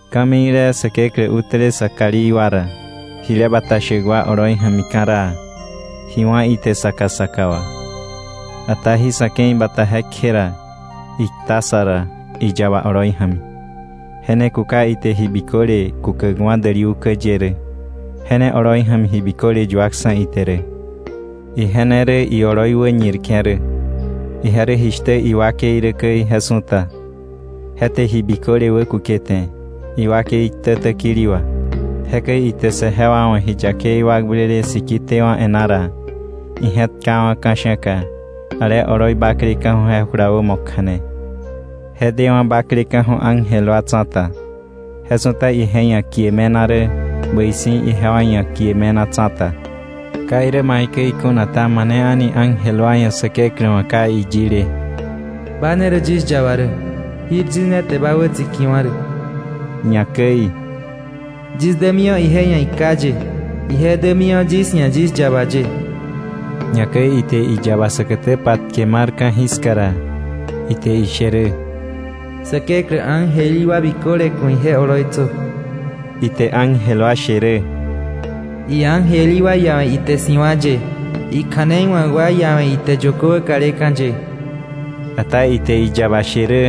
Ka̱mikle Säkeklä utäle sä kalí wa ra, jile bata shäk wa oloi ja̱mi ka̱raa, ji wá̱ ite saka saka wà. Ata jí sa̱ ke̱i bata je kje ra, ikta sa ra iyaba oloi ja̱mi. Je ne kuka ite ji biköle kukäkwa̱ däli ukä ye rä, je ne oloi ja̱mi ji biköle yuaksa̱ ite rä. Ije ne rä ioloi wäñirke̱ rä, ije rä jishtä iwakei rä käi je su̱ta. Je te ji biköle wäkukete iwakei ktä täkili wà. Jekäi ite saje wa wa̱ ji yakei wakblele siki tewa̱ e̱ná ra, ije̱tkawa̱ ka̱sha̱ka ale oloi bakleka̱ju̱ je jula wämo kja̱ne. Je dewa̱ bakleka̱ju̱ ángel wa tsa̱ta, je su̱ta ije ia̱ kie me̱na rä bäi si̱ ijewa ia̱ kie me̱na tsa̱ta. Ka irä maikäi kuna ta, ¿mane ángel wa ia̱ Säkeklä wa̱ iyile: “Ba ne rä yis yaba rä, jir yis ne te ba wätsikiwa̱ rä.” Ñakäi: “Yis dämiwa̱ ije ia̱ iKá ye, ije dämiwa̱ yis ia̱ yis yaba ye” ni rä na? A̱ni. Ñakäi ite iyaba säkätä patke mar ka̱jiska ra, ite ishe rä: “Säkeklä ángel í wa biköle ku̱ ije oloitsö.” Ite iángel wa she rä: “Iángel í wa iawe̱ ite si̱wa̱ ye, ikja̱nei wa̱k wa iawe̱ ite yökö wäkaleka̱ ye.” Ata ite iyaba she rä: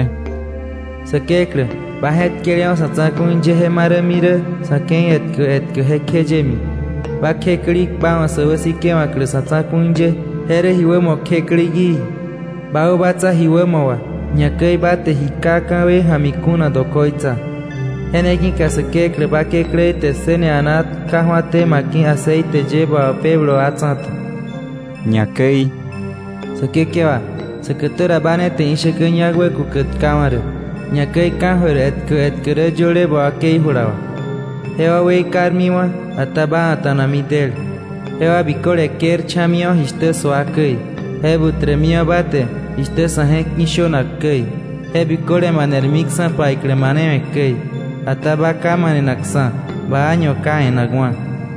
“Säkeklä, ba je̱tkelewa̱ sa̱ tsa̱ku̱i ye je marämi rä sa̱ ke̱i etkä etkä jekjeyemi, ba kjëklik, ba wa̱ sä wäsikewa̱klä sa̱ tsa̱ku̱i ye, je rä ji wämo kjëklik í. Ba wäbatsa ji wämo wà, ñakäi ba te ji ka ka̱wei ja̱mi kuna dokoitsa. Je ne ki̱ka Säkeklä, ba Kekläí te ssëne a̱naa tkaju̱até ma ki̱ aceite ye ba wapebläk wa tsa̱ta.” Ñakäi: “Säkekewa, säkätä ra ba ne te ishäkä ñak wäkukäk tkawa̱ rä. Ñakäi ka̱jöir etkä etkä rä yöle ba wakei jula wà. Jewa weikarmiwa̱, ata ba a̱ta̱nami del. Jewa biköle kërcha̱miwa̱ jishtä sua käi. Je butremiwa̱ ba te, jishtä sa̱ je̱k ki̱ shönak käi. Je biköle manermiksa̱ paiklä manewe̱ käi. Ata ba ka manenakksa̱. Ba año ka e̱nakwa̱.”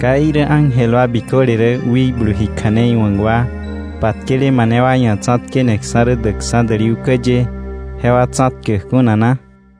¿Ka irä ángel wa biköle rä wikblu ji kja̱nei wa̱k wa, patkele mane wa ia̱ tsa̱tkeneksa̱ rä däkksa̱ däli ukä ye, jewa tsa̱tkäk kuna na?